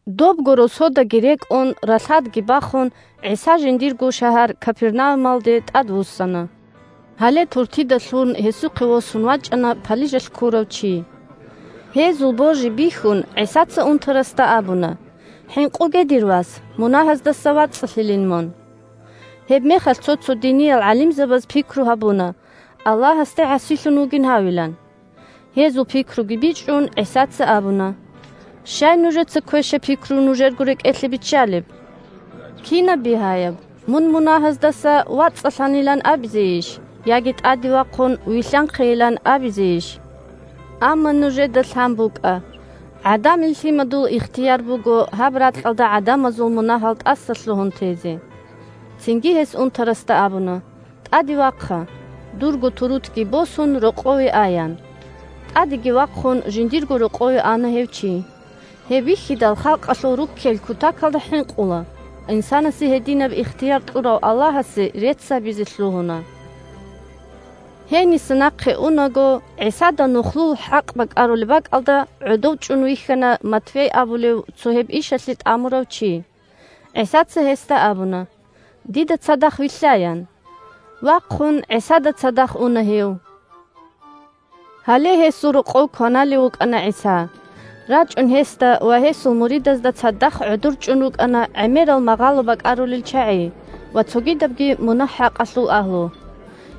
Добго росодаги рекӀун, ралъадги бахун, ГӀиса жиндирго шагьар Капернаумалде тӀадвуссана. Гьале туртида лъун гьесухъе восун вачӀана палижалъ ккурав чи. Гьезул божи бихьун, ГӀисаца унтарасда абуна: – ХӀинкъуге, дир вас, мунагьаздаса вацӀцӀалъилин мун! Гьебмехалъ цо-цо диниял гӀалимзабаз пикру гьабуна, Аллагьасде гӀасилъун вугин гьавилан. Гьезул пикруги бичӀчӀун, ГӀисаца абуна: – Щай нужеца квешаб пикру нужерго рекӀелъе биччалеб? Кинаб бигьаяб: «Мун мунагьаздаса вацӀцӀалъанилан» абизейищ, яги: «ТӀаде вахъун вилълъанхъейилан» абизейищ? Амма нужеда лъан букӀа: ГӀадамил Лъимадул ихтияр буго гьаб ракьалда гӀадамазул мунагьал тӀасалъугьун тезе. Цинги гьес унтарасда абуна: – ТӀаде вахъа. Дурго турутги босун, рокъове а, – ян. ТӀадеги вахъун, жиндирго рокъове ана гьев чи. Гьеб бихьидал, халкъалъул руккел кутакалда хӀинкъула, инсанасе гьединаб ихтияр кьурав Аллагьасе рецц гьабизе лъугьуна. Гьениса нахъе унаго, ГӀисада нухлул хӀакъ бакӀарулеб бакӀалда гӀодов чӀун вихьана Матфей абулев цо гьеб ишалъе тӀамурав чи. ГӀисаца гьесда абуна: – Дида цадахъ вилълъа, – ян. Вахъун ГӀисада цадахъ уна гьев. Гьале гьесул рокъов кваналев вукӀана ГӀиса. РачӀун гьесда ва гьесул муридазда цадахъ гӀодор чӀун рукӀана гӀемерал магъало бакӀарулел чагӀи ва цогидабги мунагь-хӀакъалъул агьлу.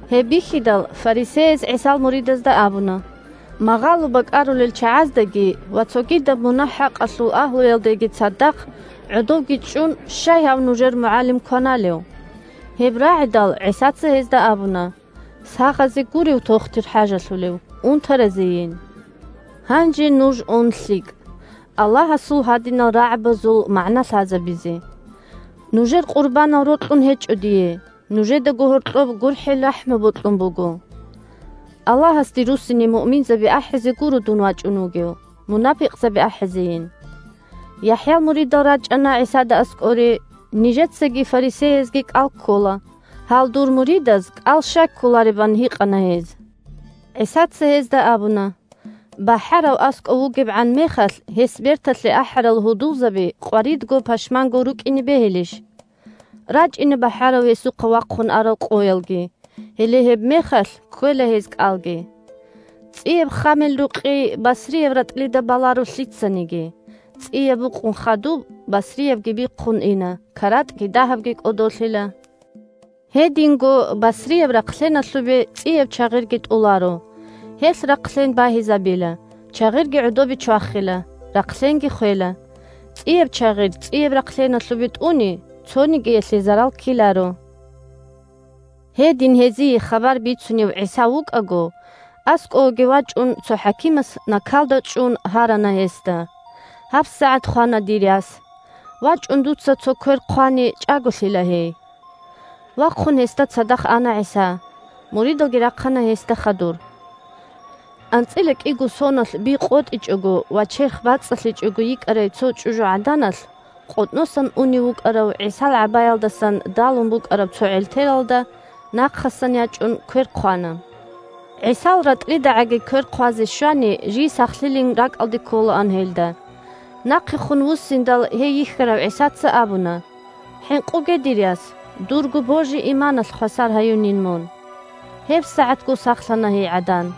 Гьеб бихьидал, фарисеяз ГӀисал муридазда абуна: – Магъало бакӀарулел чагӀаздаги ва цогидаб мунагь-хӀакъалъул агьлуялдаги цадахъ гӀодовги чӀун щай гьав нужер мугӀалим кваналев? Гьеб рагӀидал, ГӀисаца гьезда абуна: – Сахазе гурев тохтир хӀажалъулев, унтаразейин. Гьанже нуж ун лъикӀ, Аллагьасул гьадинал рагӀабазул магӀна лъазабизе: «Нужер къурбанал рокьун гьечӀо дие, нужедаго гьоркьоб гурхӀел-рахӀму бокьун буго». Аллагьасде руссине муъминзаби ахӀизе гуро дун вачӀун вугев, мунапикъзаби ахӀизейин. ЯхӀял муридал рачӀана ГӀисада аскӀоре: – Нижецаги фарисеязги кӀал ккола, гьал дур муридаз кӀал щай кколареб? – ан гьикъана гьез. ГӀисаца гьезда абуна: – БахӀарав аскӀов вугебгӀан мехалъ гьес берталъе ахӀарал гьудулзаби къваридго-пашманго рукӀине бегьилищ? РачӀина бахӀарав гьезухъа вахъун арал къоялги, гьеле гьебмехалъ кквела гьез кӀалги. ЦӀияб ххамил рукъи басрияб ратӀлида баларо лъицаниги, – цӀияб букъун хадуб, басриябги бихъун ина, каратӀги дагьабги кӀодолъила. Гьединго басрияб рахълъеналъубе цӀияб чагъирги тӀоларо. Гьелъ рахълъен багьизабила, чагъирги гӀодобе чвахила, рахълъенги хвела. ЦӀияб чагъир цӀияб рахълъеналъубе тӀуни, цонигиялъе зарал ккеларо. Гьедин гьезие хабар бицунев ГӀиса вукӀаго, аскӀовеги вачӀун, цо хӀакимас накалда чӀун гьарана гьесда: – ГьабсагӀат хвана дир яс. ВачӀун дуца цо квер хъвани, чӀаголъила гьей. Вахъун гьесда цадахъ ана ГӀиса, муридалги рахъана гьесда хадур. АнцӀила кӀиго соналъ би къотӀичӀого ва черх бацӀцӀалъичӀого йикӀарай цо чӀужугӀаданалъ къотӀносан унев вукӀарав ГӀисал гӀабаялдасан далун букӀараб цо гӀертелалда нахъасан ячӀун квер хъвана. ГӀисал ратӀлидагӀаги квер хъвазе щвани, жий сахлъилин ракӀалде кколаан гьелда. Нахъехун вуссиндал гьей йихьарав ГӀисаца абуна: – ХӀинкъуге, дир яс, дурго божи-иманалъ хвасар гьаюнин мун. ГьебсагӀатго сахлъана гьей гӀадан.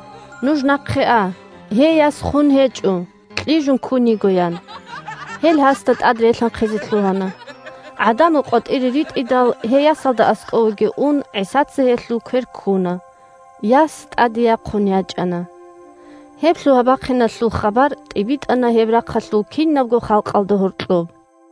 ГӀисаца гьезда абуна: – Нуж нахъе а. Гьей яс хун гьечӀо, кьижун ккун йиго, – ян. Гьел гьасда тӀад релъанхъизе лъугьана. ГӀадамал къватӀире ритӀидал, гьей ясалда аскӀовеги ун, ГӀисаца гьелъул квер ккуна, – яс тӀаде яхъун ячӀана. Гьеб лъугьа-бахъиналъул хабар тӀибитӀана гьеб рахъалъул кинабго халкъалда гьоркьоб.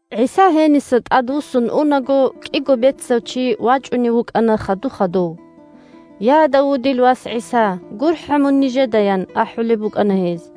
ГӀиса гьениса тӀадвуссун унаго, кӀиго бецав чи вачӀунев вукӀана хаду-хадув. – Я, Давудил Вас Давудил умматалъул чи. ГӀиса! ГурхӀа мун нижеда! – ян ахӀулеб букӀана гьез.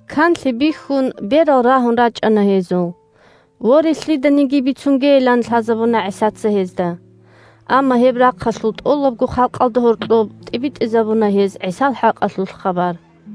Канлъи бихьун, берал рагьун рачӀана гьезул. Воре, лъиданиги бицунгейилан лъазабуна ГӀисаца гьезда. Амма гьеб рахъалъул тӀолабго халкъалда гьоркьоб тӀибитӀизабуна гьез ГӀисал хӀакъалъулъ хабар.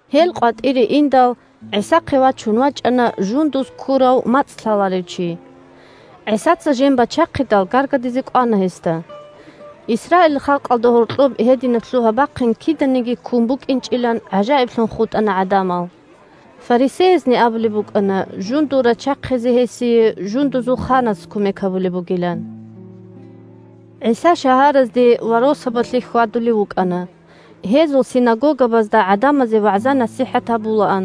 Гьел къватӀире индал, ГӀисахъе вачун вачӀана жундуз ккурав мацӀ лъаларев чи. ГӀисаца жен бачахъидал, гаргадизе кӀвана гьесда. Исраилил халкъалда гьоркьоб гьединаб лъугьа-бахъин киданиги ккун букӀинчӀилан гӀажаиблъун хутӀана гӀадамал. Фарисеязни абулеб букӀана жундул рачахъизе гьесие жундузул ханас кумек гьабулеб бугилан. ГӀиса шагьаразде ва росабалъе хьвадулев вукӀана. Гьезул синагогабазда гӀадамазе вагӀза-насихӀат гьабулаан,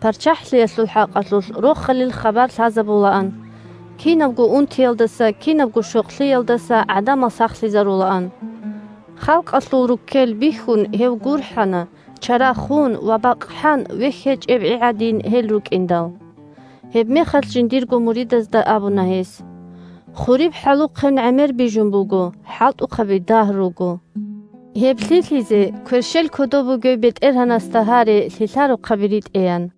ПарччахӀлъиялъул хӀакъалъулъ Рохалил хабар лъазабулаан, кинабго унтиялдаса, кинабго щокълъиялдаса гӀадамал сахлъизарулаан. Халкъалъул руккел бихьун, гьев гурхӀана, чара хун ва бакъхӀан, вехь гьечӀеб гӀи гӀадин, гьел рукӀиндал. Гьебмехалъ жиндирго муридазда абуна гьес: – Хуриб хӀалухъен гӀемер бижун буго, хӀалтӀухъаби дагь руго. Гьеб лъилъизе кверщел кодоб бугев БетӀергьанасда гьаре лъилъарухъаби ритӀеян.